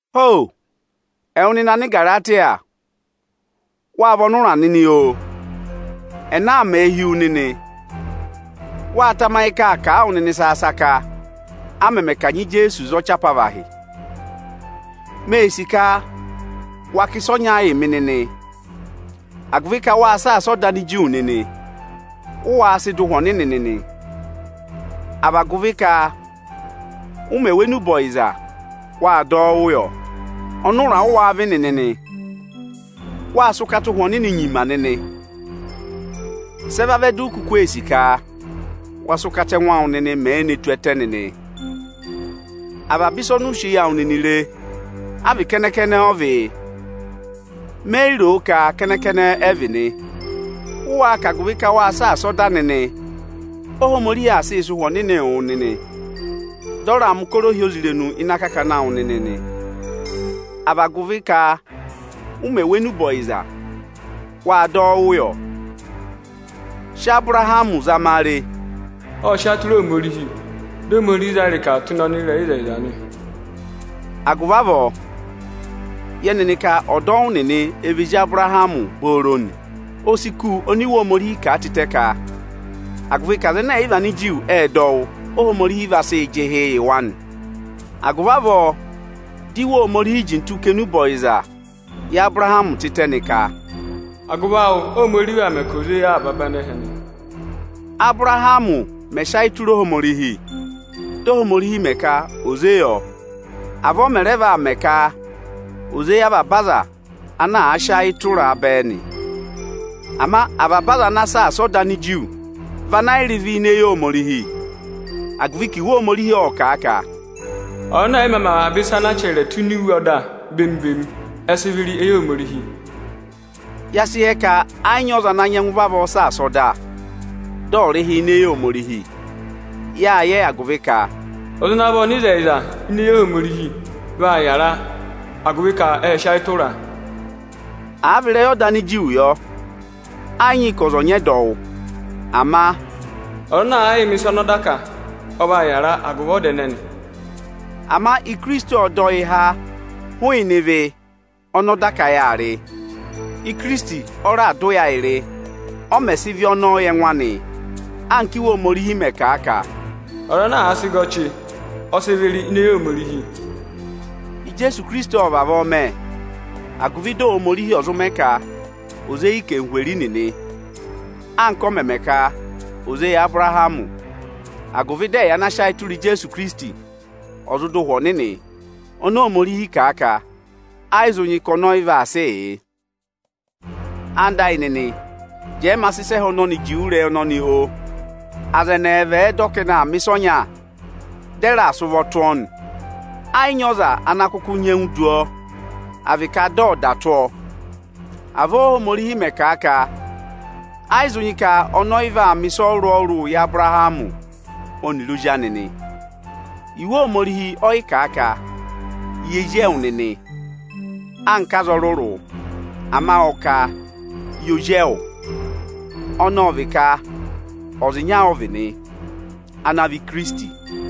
Ho! Ẹwụ nịnị Anigaratiya, wáa vị ọnụra nịnị, oo! Ẹnẹ aa mẹẹ hi wu nịnị? Wáá tamayị ka áa kà a wụ nịnị saka-saka, a mẹmẹ kanyị Ijeesu za ọchị apavahị? Mee sì ka wa kà ịsa ọnya yị mị nịnị: Agụvị ka wáa saasa ọda Aniju nịnị, ụ wáá sị dọ Ụhwẹ Ọnịnị nị, à vị agụvị ka ụ mẹ̀ wụ́ enube ọyịza, wáa dọ wụ́ yọ? Ọnụra ụ wáá vị nịnị nị? Wáa sị ụkata Ụhwẹ Ọnịnị nyima nịnị. Sị ẹ vavẹ du u kuku ee sì ka wa sị ụkata ẹngụ awụ nịnị mẹẹ ne tù ẹtẹ nịnị? Avaba ịsa ọnị ụ sị eyi awụ nịnị re, a vị kẹnẹ-kẹnẹ ọ vịị? Me yi ro ka kẹnẹ-kẹnẹ ẹ vị nị. Ụ wáá ka agụvị ka wáa saasa ọda nịnị, Óhomorihi aa sịị sị Ụhwẹ Ọnịnị wụ nịnị, dị ọ raa mẹ̀ ụkọrọ ohyozirenu ịnị akakana awụ nịnị nị, à vị agụvị ka ụ mẹ̀ wụ́ enube ọyịza, wáa dọ wụ́ yọ? Sị Ábụrahamị zama a re, “ọ́ọ sị ayị tụra Ohomorihi, dị Ohomorihi zaa ịrịka tụ́ ịnị ọnịrẹyịzẹyịza nị.” Agụvị avọọ, yẹ nịnị ka ọdọwụ nịnị ẹ vị ezi Abụrahamị booro nị. O si kù oni Iwe Ohomorihi kà a tịtẹ ka agụvị ka aza ẹnẹ ẹ̀ yị vị Aniju ẹ́ẹ dọ wụ́, Ohomorihi vaa sị jị ịhị yị wa nị. Agụvị avọọ dị Iwe Ohomorihi jintu kà enube ọyịza yị Abụrahamị tịtẹ nị ka, “Agụvị awụ Óhomorihi vaa mẹ ka ò zé yị avaba anẹhẹ nị.” Ábụrahamị mẹ̀ sị ayị tụra Ohomorihi, di Ohomorihi mẹ ka ò zé yọ, avọọ ọ mẹ̀ rẹ vaa mẹ ka ò zé yị avaba aza ana àa sị ayị tụra a bẹẹ nị. Ama avaba aza ana àa saasa ọda Aniju vị ana yị rị ịvị ini eyi Ohomorihi; agụvị ka Iwe Ohomorihi ọ́ọ kà a ka, “Ọza ẹnẹ ẹ̀ yị mā mẹ avaba ịsa ana a chẹrẹ tụ́ ini iwe ọda bemi-bemi, ẹ sị ịvị rị ini eyi Ohomorihi.” Ya sị yẹ ka ẹ yị nyị ọza ana nyẹngụ vavọọ saasa ọda, dị ọ̀ rị ịhị ini eyi Ohomorihi. Yáa yẹ agụvị ka, “Aza ana vị ọnịzẹyịza (ini eyi Ohomorihi) vaa yàra, agụvị ka ẹ́ẹ sị ayị tụra a.” Àa vị ịrẹyị ọda Aniju yọ, ẹ yị nyị ka ọza ọ̀ nyị ẹdọwụ. Ama “ọza ana àa yịị mẹ̀ ịsa ọnị ọda kà, ọ vaa yàra agụvị ọda ẹnẹẹ nị.” Ama Ikirisiti ọ́ọ dọ yị há hụụnị ịvị ọnị ọda ka yáa rị. Ikirisiti ọ raà dọ ụya ayị rị, ọ mẹ̀ sị ịvị ọnọọ yị ẹngụ anị, anka Íwe Ohomorihi mẹ̀ kà a ka, “Ọza ana àa sị gẹ ọchị, ọ sị ịvị rị ini eyi Ohomorihi.” Ijeesu Ikirisiti ộ vavọọ mẹ, agụvị dị Ohomorihi ọ̀ zụ mẹ ka ò zé yị anarịmadọwụ nịnị, anka ọ mẹ̀ mẹ ka ò zé yị Abụrahamị; agụvị dị ẹyị ana sị ayị tụra Ijeesu Ikirisiti, ọ̀ zụ dụ Ụhwẹ Ọnịnị oni Ohomorihi kà a ka ayị zụ nyị ka ọnị ọyị vaa sịị yị. Ẹwụ nịnị ẹyịnyara amị, jẹẹ ma sị ịsa ẹhẹ ọnọnị juwe ịrẹyị ọnọnị, oo! Aza ẹnị ẹẹva ẹ̀ẹ dọ ka ẹnị aa mẹ̀ ịsa ọnya, dị ẹ raà hị́ eku tụ́ ọọ nị, ẹ yị nyị ọza ana kụkụ nyẹngụ du ọọ, à vị ka dị ọ̀ dà tụ́ ọọ. Avọọ Óhomorihi mẹ̀ kà a ka ayị zụ nyị ka ọnị ọyị vaa mẹ̀ ịsa ọrụrụ-ọrụrụ yị Abụrahamị ọnịrị ozi anị nị. Iwe Ohomorihi ọyị kà a ka: “yị ezi ewu nịnị”, anka aza ọrụrụ, ama ọ ka: “yị ozi ewu,” ọnị ọ vị ka ọza ịnya ọ vị nị, ana vị Ikirisiti.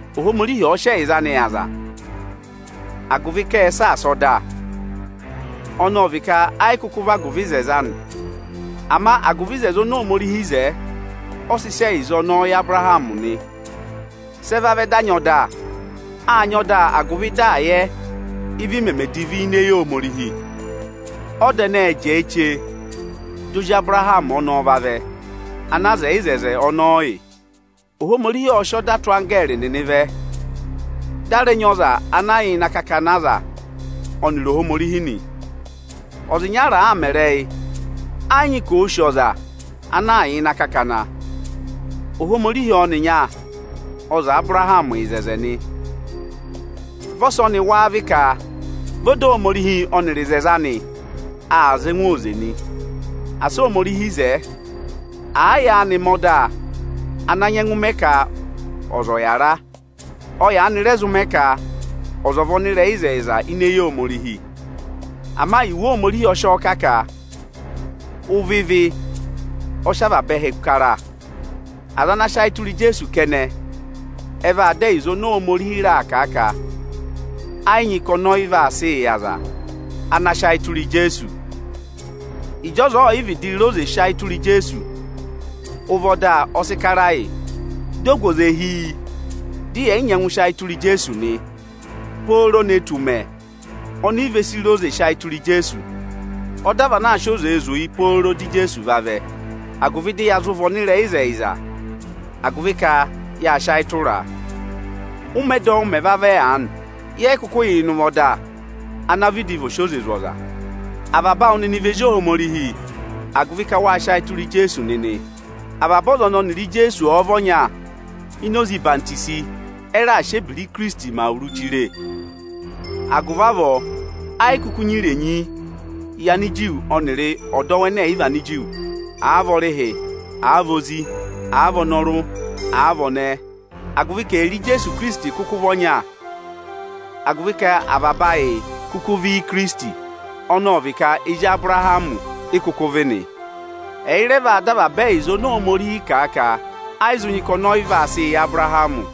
Ohomorihi ọ̀ọ sị ẹyịza anị yị aza agụvị ka ẹ́ẹ saasa ọda, ọnị ọ vị ka ẹ yị kụkụ vị agụvị oto anị. Ama agụvị oto oni Ohomorihi wo, ọ sị sị ẹyịza ọnọọ yị Abụrahamị nị. Sị ẹ vẹ dị Ohomorihi sị ọda vẹ? Sị ẹ vavẹ di a nyị ọda? Â nyị ọda, agụvị dị à yẹ ị́vị meme divi ini eyi Ohomorihi. Ọda ẹnẹẹ ẹ́ẹ jẹẹ chee di ozi Abụrahamị ọnọọ ọ̀ vavẹ, ene wo oto ọnọọ yị. Ohomorihi ọ́ọ sị ọda tụ́ anggẹẹrị nịnị vẹ, di a rẹ nyị ọza ana yà ịnị akakana aza ọnịrị Ohomorihi nị. Ọza ịnyara àa mẹ ịrẹyị, ẹ yị nyị ka òo sì ọza ana aa yà ịnị akakana; Ohomorihi ọnịnya ọ zẹẹ Abụrahamị ịzẹzẹ nị. Vị ọsọnị wáá vị ka vị ọda Ohomorihi ọnịrị oto anị aa za ẹngụ oze nị? Asị Ohomorihi zẹẹ! Àa yaanị mẹ ọda ana nyẹngụ mẹ ka ọza ọ̀ yàra, ọ yaanị rẹ zụ mẹ ka ọza ọ̀ vị ọnịrẹyịzẹyịza ini eyi Ohomorihi. Ama Iwe Ohomorihi ọ sị ọọ kà ka ụvọ ịvị ọ sị avaba ẹhẹ kara. Aza ana sị ayị tụra Ijeesu kẹnẹ, ẹ vaa dọ ẹyịza ọnọọ oni Ohomorihi raà kà a ka ẹ yị nyị ka ọnị ọyị vaa sịị yị aza ana sị ayị tụra Ijeesu. Ịjị ọza ọọ̀ yị vịdị re oze sị ayị tụra Ijeesu, ụvọ ọda ọ sị kara yị, di o gu oze hi yi, di yẹ̀ yị nyẹngụ sị ayị tụra Ijeesu nị, pooro ne tù ụmẹ oni i ve si re oze sị ayị tụra Ijeesu. Ọda vị anaa sị oze zụ̀ yị pooro dị Ijeesu vavẹ, agụvị dị ya zụ vị ọnịrẹyịzẹyịza, agụvị ka yáa sị ayị tụraa. Ụ́mẹ ẹdọwụ mẹ̀ vẹ aanị, yẹ yị kụkụ yà ịnị ụvọ ọda ana vịdị aa sị oze zụ ọza. Avaba awụ nịnị vị ezi Ohomorihi, agụvị ka wáa sị ayị tụra Ijeesu nịnị. Avaba ọza ọnị ọnịrị Ijeesu ọ̀ọ vị ọnya ini oze ọyịhwenyi, ẹ raà sị ebira Ikirisiti mẹ awuru chire. Agụvị avọọ, ẹ yị kụkụ nyị irenyi yị Aniju ọnịrị ọdọwụ ẹnẹ ẹ̀yị vị Aniju; àa vị ọrịhị, àa vị ozi; àa vị ọnọrụ, àa vị ọnẹẹ; agụvị ka ẹyịrị Ijeesu Ikirisiti kụkụ vị ọnya. Agụvị ka avaba ayị kụkụ vị Íikirisiti, ọnị ọ vị ka ezi Abụrahamị i kụkụ vị nị. Ẹyị rẹ vaa dọ avaba ẹyịza oni Ohomorihi kà a ka ayị zụ nyị ka ọnị ọyị vaa sị yị Abụrahamị.